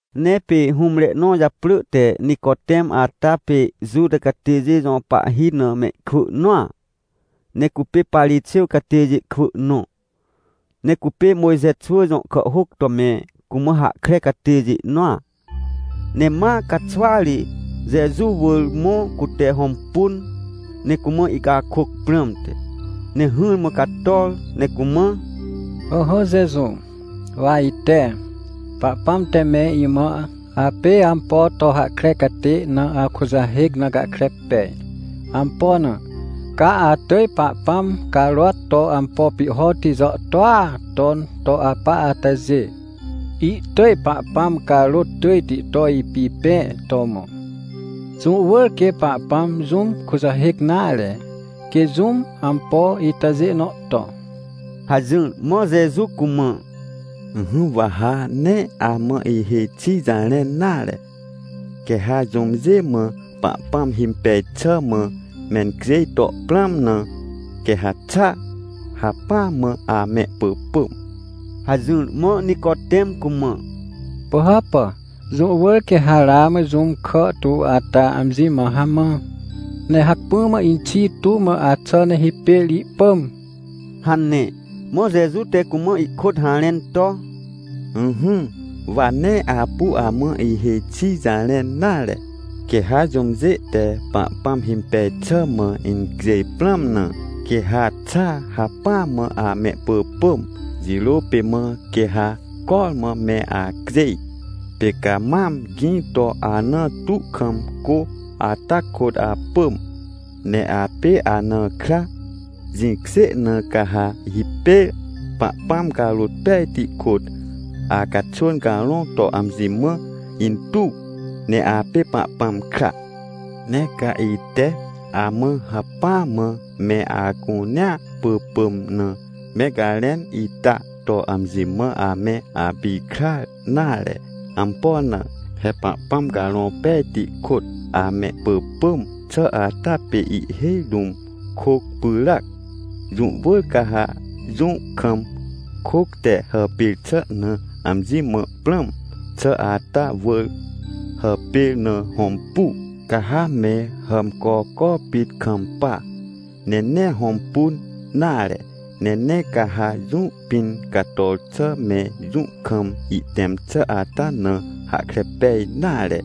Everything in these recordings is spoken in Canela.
Ne pê hũmre nõ japrỳ te Nicotem ata pê Juta catêjê jõ pahhi na mehkwỳ nõa, ne cupê Parixêw catêjê kwỳ nõ, ne cupê Mojxe xwỳ jõ kàhhôc to me cumã hahkre catêjê nõa. Ne ma caxwa ri Jeju wỳr mõ, cute hõmpun, ne cumã ihcakôc prãmte. Ne hỹrmã cator ne cumã: — Ỹhỹ Jeju, wa ite, Pahpãm te me imã apê ampo to hahkre catê na akujahêc na gahkre pej. Ampo na? Ca atỳj Pahpãm carôat to ampo pihhoti jàhtôa ton to apa atajê, ihtỳj Pahpãm carôt tỳjti to ipipẽ to mõ. Jũ wỳr quê Pahpãm jũm kujahêc nare, quê jũm ampo itajê nõ to — hajỹr. Mã Jeju cumã: — Ỹhỹ, wa ha nee amã ihêj xi jarẽn nare. Quê ha jũmjê mã Pahpãm himpej xà mã mencjêj to prãm na, quê ha xa hacpỹa mã amehpỳpỳm — hajỹr. Mã Nicotem cumã: — Pỳhàpà, jũ wỳr quê ha ramã jũm kàhtu ata amji mã hamã, nehacpỹa mã inxi tu mã axà ne hipêr ihpỳm — hane. Mã Jeju te cumã ihkôt harẽn to: — Ỹhỹ, wa nee apu amã ihêj xi jarẽn nare. Quê ha jũmjê te Pahpãm himpej xà mã incjêj prãm na, quê ha xa hacpỹ mã amehpỳpỳm, jirô pê mã quê ha cormã me acjêj. Pê ca mam gĩ to, anã tu kam cô ata kôt apỳm, ne apê anã kra. Jĩkjê na, ca ha hipêr Pahpãm Carõ Pejti kôt, acaxwỳn carõ to amji mã intuw, ne apê Pahpãm kra. — Nee ca ite amã hacpỹa mã, me acunea pỳpỳm na me garẽn ita to amji mã ame apikrar nare. Ampo na? He Pahpãm Carõ Pejti kôt amehpỳpỳm xà ata pê ihhêj rũm kôc pyràac. Jũ wỳr ca ha jũ kam kôc te hàpêr xà na amji mã prãm xà ata wỳr hàpêr na hõmpu. Ca ha me hàmcoco pit kampa, ne nee hõmpun nare. Ne nee ca ha jũ pĩn cator xà me, jũ kam ihtẽm xà ata na hahkre pej nare.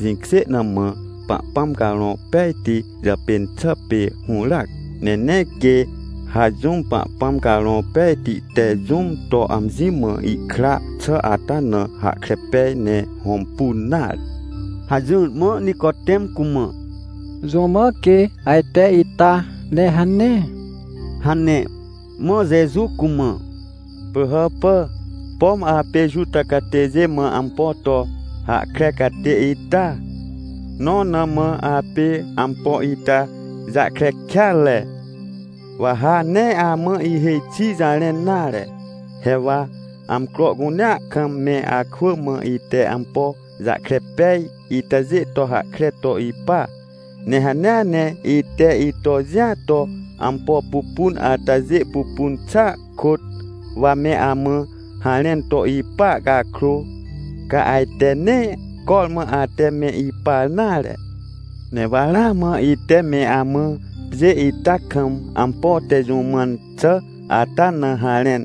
Jĩkjê na mã, Pahpãm Carõ Pejti jàpên xà pê hũràac. Ne nee quê ha jũm Pahpãm Carõ Pejti te jũm to amji mã ihkra xà ata na hahkre pej ne hõmpun nare — hajỹr. Mã Nicotem cumã: — Jũ mã quê ajte ita, ne hane? — hane. Mã Jeju cumã: — Pỳhàpà, pom apê Juta catêjê mã ampo to hahkre catê ita! Nõ na mã apê ampo ita jahkre kêatre? Wa ha nee amã ihêj xi jarẽn nare. He wa amcro cunea kam me akwỳ mã, ite ampo jahkre pej itajê to hahkre to ipa. Ne hanea ne ite ito jĩa to ampo pupun atajê pupun xàa kôt, wa me amã harẽn to ipa cakrô, ca ajte nee cormã ate me ipar nare. Ne wa ramã ite me amã pjê ita kam ampo te jũ mãn xà ata na harẽn,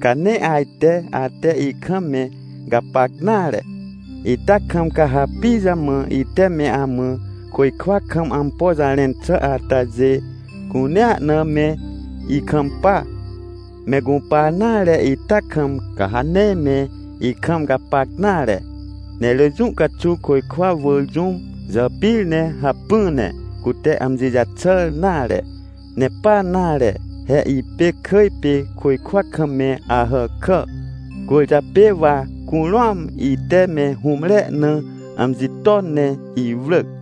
ca nee ajte ate ikam me gapac nare. Ita kam, ca ha pijamã ite me amã côjkwa kam ampo jarẽn xà atajê cunea na me ikampa? Me gũpar nare ita kam, ca ha nee me ikam gapac nare. Ne rỳ jũ caxuw côjkwa wỳr jũm jàpir ne hacpỹ ne cute amji jaxàr nare. Ne pa nare, he ipê kỳj pê, côjkwa kam me Ahàkà, cwỳrjapê wa curũam ite me hũmre na amji ton ne iwrỳc.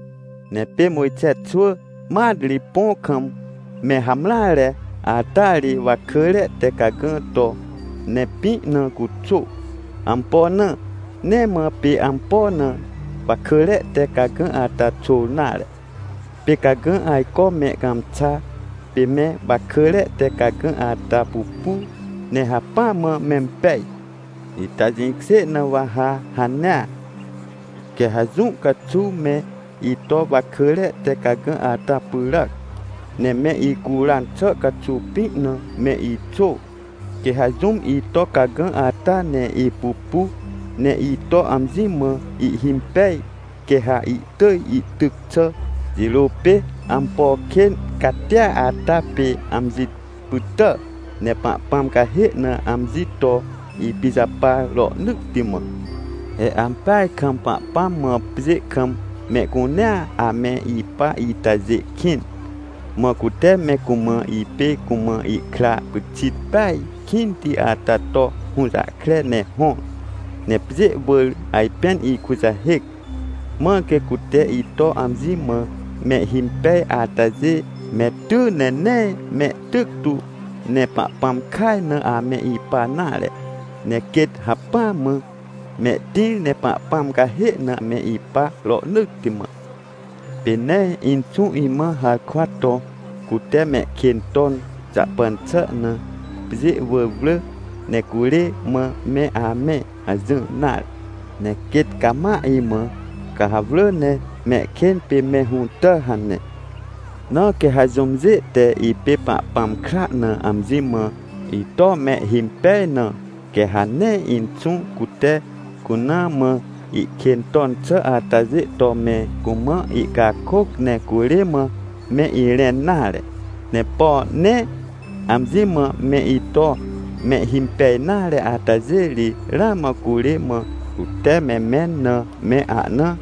— Ne pê Mojxe xwỳ mat ri, põ kam me hamreare ata ri, wakỳre te cagã to, ne pĩ na cuxô. Ampo na? Nee mã pê ampo na wakỳre te cagã ata xôr nare. Pê cagã ajco me cãmxa, pê me wakỳre te cagã ata pupu, ne hacpỹa mã mempej. Ita jĩkjê na wa ha hanea. Quê ha jũ caxuw me ito wakỳre te cagã ata pyràac, ne me icuran xà caxuw, pĩ na me ixô. Quê ha jũm ito cagã ata ne ipupu, ne ito amji mã ihhimpej, quê ha ihtỳj ihtyc xà jirô pê ampo kên catia ata pê amji pytà, ne Pahpãm cahê na amji to ipijapar rohnỳtti mã. — He ampeaj kam Pahpãm mã pjê kam mehcunea ame ipa itajê kĩn, mã cute me cumã, ipê cumã ihkra pyxit peaj kĩnti ata to hũjahkre ne hõr, ne pjê wỳr ajpên ikujahêc. Mãr quê cute ito amji mã mehhimpej atajê me ty, ne nee mehtyc tu ne Pahpãm kaj na ame ipa nare, ne quêt hacpỹa mã mehtĩr, ne Pahpãm cahê na me ipa rohnỳtti mã. Pê nee Inxũ imã harkwa to: “Cute mehkên ton jahpan xà na, pjê wỳr wrỳ ne curê mã me amẽ” hajỹr nare. Ne quêt cama imã: “Ca ha wrỳ ne mehkên pê me hũtà” hane. — Na quê ha jũmjê te, ipê Pahpãm kra na amji mã ito mehhimpej na, quê ha nee Inxũ cute cuna mã ihkên ton xà atajê to me cumã ihcakôc, ne curê mã me irẽn nare. Ne por nee amji mã me ito mehhimpej nare atajê ri, ramã curê mã cute me mẽn na, me ahna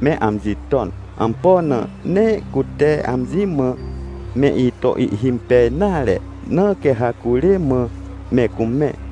me amji ton. Ampo na? Nee cute amji mã me ito ihhimpej nare, na quê ha curê mã me cumẽ.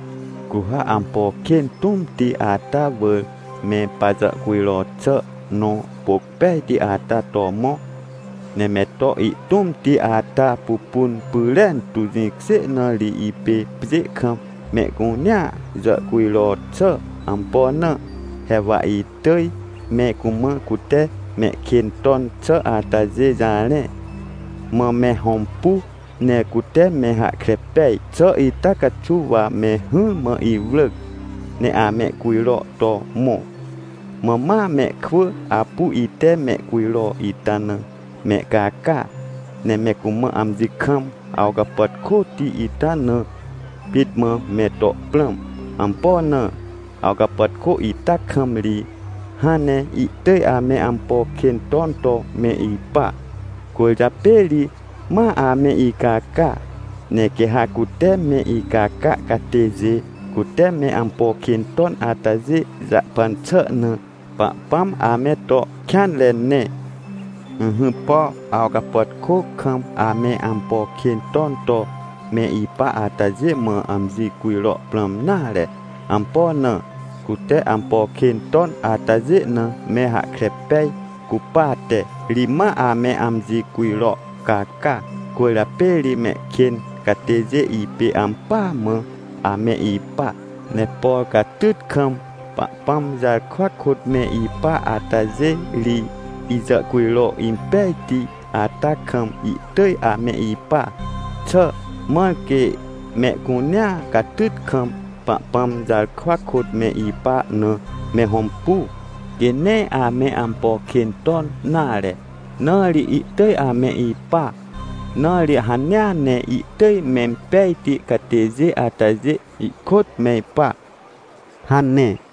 — Cu ha ampo kên tũmti ata wỳr me pajàhcujro xà nõ, pôc pejti ata to mõ, ne me to ihtũmti ata pupun pyrentu. Jĩkjê na ri ipê pjê kam mehcunea jàhcujro xà. Ampo na? He wa itỳj me cumã cute mehkên ton xà atajê jarẽ, mã me hõmpu, ne cute me hahkre pej xà ita caxuw wa me hỹrmã iwrỳc, ne amehcujro to mõ. Mã ma mehkwỳ apu ite mehcujro ita na mehcaca, ne me cumã amji kam awcapàtkôti ita na pit mã me to prãm. Ampo na? Awcapàtkô ita kam ri hãn ne ihtỳj ame ampo kên ton to me ipa, cwỳrjapê ri ma ame icaca. Ne quê ha, cute me icaca catêjê cute me ampo kên ton atajê jahpan xà na, Pahpãm ame to kêanre ne. — Ỹhỹ, por awcapàtkô kam ame ampo kên ton to me ipa atajê mã amji cujro prãm nare. Ampo na? Cute ampo kên ton atajê na me hahkre pej cupate ri ma ame amji cujro caca. Cwỳrjapê ri mehkên catêjê ipê ampỳa mã ame ipa. Ne por catyt kam Pahpãm jarkwa kôt me ipa atajê ri, ijàhcujro impejti ata kam ihtỳj ame ipa xà. Mãr quê mehcunea catyt kam, Pahpãm jarkwa kôt me ipa na me hõmpu, quê nee ame ampo kên ton nare, na ri ihtỳj ame ipa. Na ri hanea ne ihtỳj mempejti catêjê atajê ikôt me ipa — hane.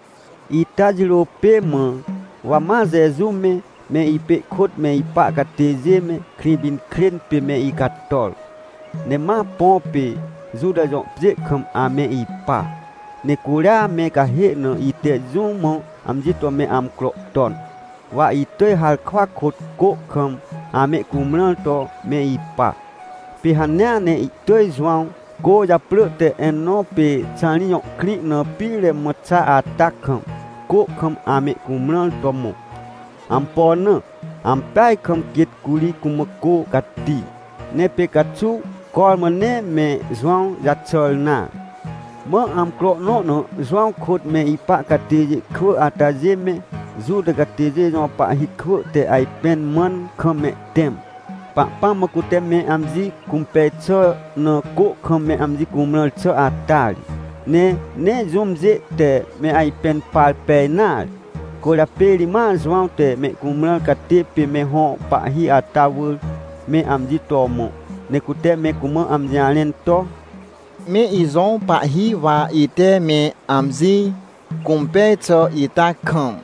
Ita jirô pê mã, wa ma Jeju me, me ipê ihkôt me ipa catêjê me, Krĩpinkrên pê me icator, ne ma põ pê Juta jõ pjê kam ame ipa. Ne curia me cahê na ite jũ mã amji to me amcro ton, wa itỳj harkwa kôt cô kam amehcumrãr to me ipa. Pê hanea ne ihtỳj Jowãw, cô japrỳ te Enõ pê Xarim jõ krĩ na pire mã xa ata kam, cô kam amehcumrãr to mõ. Ampo na? Ampeaj kam quêt curi cumã cô cati. Ne pê caxuw cormã nee me Jowãw jaxàr nare. Mã amcro nõ na Jowãw kôt me ipa catêjê kwỳ atajê me, Juta catêjê jõ pahhi kwỳ te ajpẽn mãn kam mehtẽm, Pahpãm mã cute me amji cũmpej xà na cô kam me amji cumrãr xà ata ri. Ne nee jũmjê te me ajpẽn par pej nare. Cwỳrjapê ri ma Jowãw te mehcumrãr catê pê me hõ pahhi ata wỳr, me amji to mõ, ne cute me cumã amji jarẽn to: — Me ijõ pahhi, wa ite me amji cũmpej xà ita kam,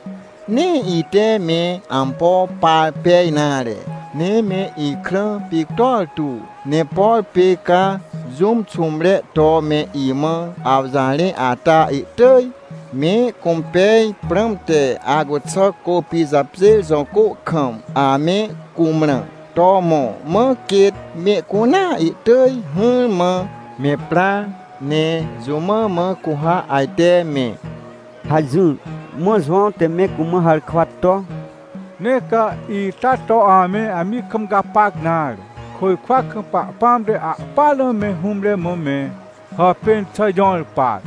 nee ite me ampo par pej nare, ne me ikrã pictor tu. Ne por pê ca jũm xũmre to me imã awjarẽ ata, ihtỳj mehcũmpej prãmte, acuxà Côpijapjêr jõ cô kam ame cumrãr to mõ, mã quêt mehcunea ihtỳj hỹrmã me pra! Ne jũ mã mã cu ha ajte me? — hajỹr. Mã Jowãw te me cumã harkwa to: — Nee ca ita to ame amji kam gapac nare. Côjkwa kam Pahpãm te ahpỹanre na me hũmre mã me hàpên xà jõr par.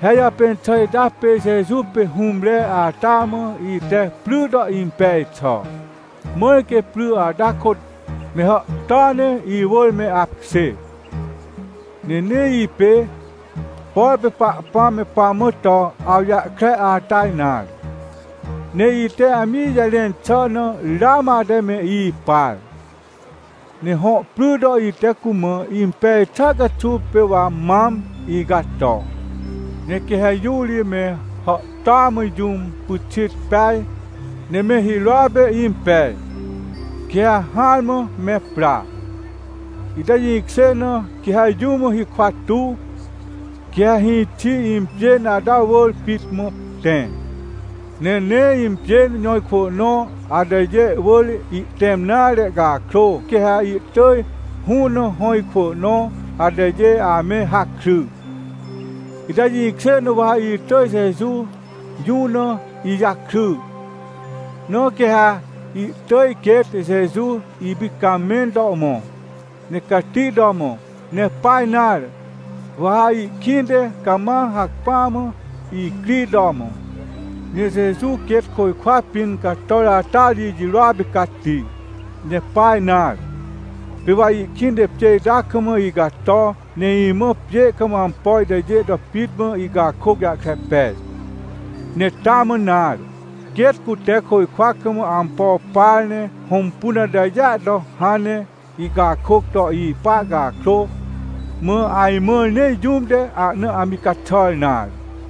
He ijàpên xà ita pê Jeju pê hũmre ata mã ite pry to impej xà, mãr quê pry ata kôt me hàhtôa ne ihwỳr me apkjê. Ne nee ipê, por pê Pahpãm me pamã to awjahkre ata nare, ne ite amji jarẽn xà na ramã ate me ipar. Ne hõ pry to ite cumã impej xà caxuw pê wa mam icato. Ne quê ha jõ ri me hàhtôa mã jũm pyxit peaj ne me hirôa pê impej, quê ha hỹarmã me pra. Ita jĩkjê na, quê ha jũm hikwa tuw, quê ha hĩxi impjên ata wỳr pit mã tẽ, ne nee impjên jõ ikwỳ nõ atajê wỳr ihtẽm nare cakrô, quê ha ihtỳj hũ na hõ ikwỳ nõ atajê ame hakry. Ita jĩkjê na wa itỳj Jeju jũ na ijakry. Na quê ha ihtỳj quêt Jeju ipicamẽn to mõ, ne cati to mõ, ne pa nare, wa ha ihkĩnte cama hacpỹa mã icri to mõ. — Ne Jeju quêt côjkwa pĩn cator ata ri ijirôa pê cati. Ne pa nare, pê wa ihkĩnte pjê ita kam icato, ne imã pjê kam ampo itajê to pit mã icakôc jahkre pej. Ne taa mã nare, quêt cute côjkwa kam ampo par ne hõmpun atajêa to hãn ne ihcakôc to ipa cakrô, mã ajmãr nee jũm te ahna amji caxàr nare.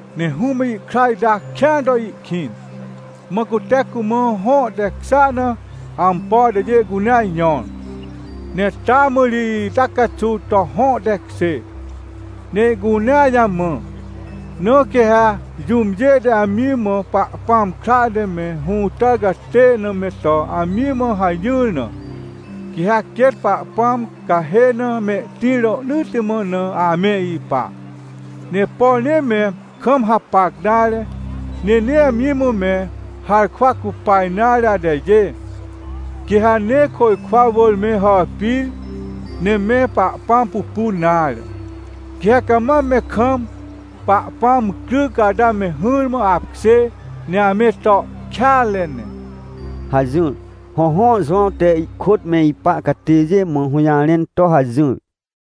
— Ne Hũm mã ihkra ita kĩan to ihkĩn, mã cute cumã hõ tekjêa na ampo atajê cunea jõr, ne taa mã ri ita caxuw to hõ tekjê, ne ihcunea jamã. Na quê ha jũmjê te amji mã Pahpãm kra te me hũtàr catê na me to amji mã hajỹr na, quê ha quêt Pahpãm cahê na mehtĩr rohnỳtti mã na ame ipa. Ne por nee me kam hapac nare, ne nee amji mã me harkwa cupa nare atajê, quê ha nee côjkwa wỳr me hàpir, ne me Pahpãm pupun nare. Quê ha cama me kam Pahpãm cryc ata me hỹrmã apkjê, ne ame to kêanre ne — hajỹr. Hõhõ, Jowãw te ihkôt me ipa catêjê mã hũjarẽn to hajỹr.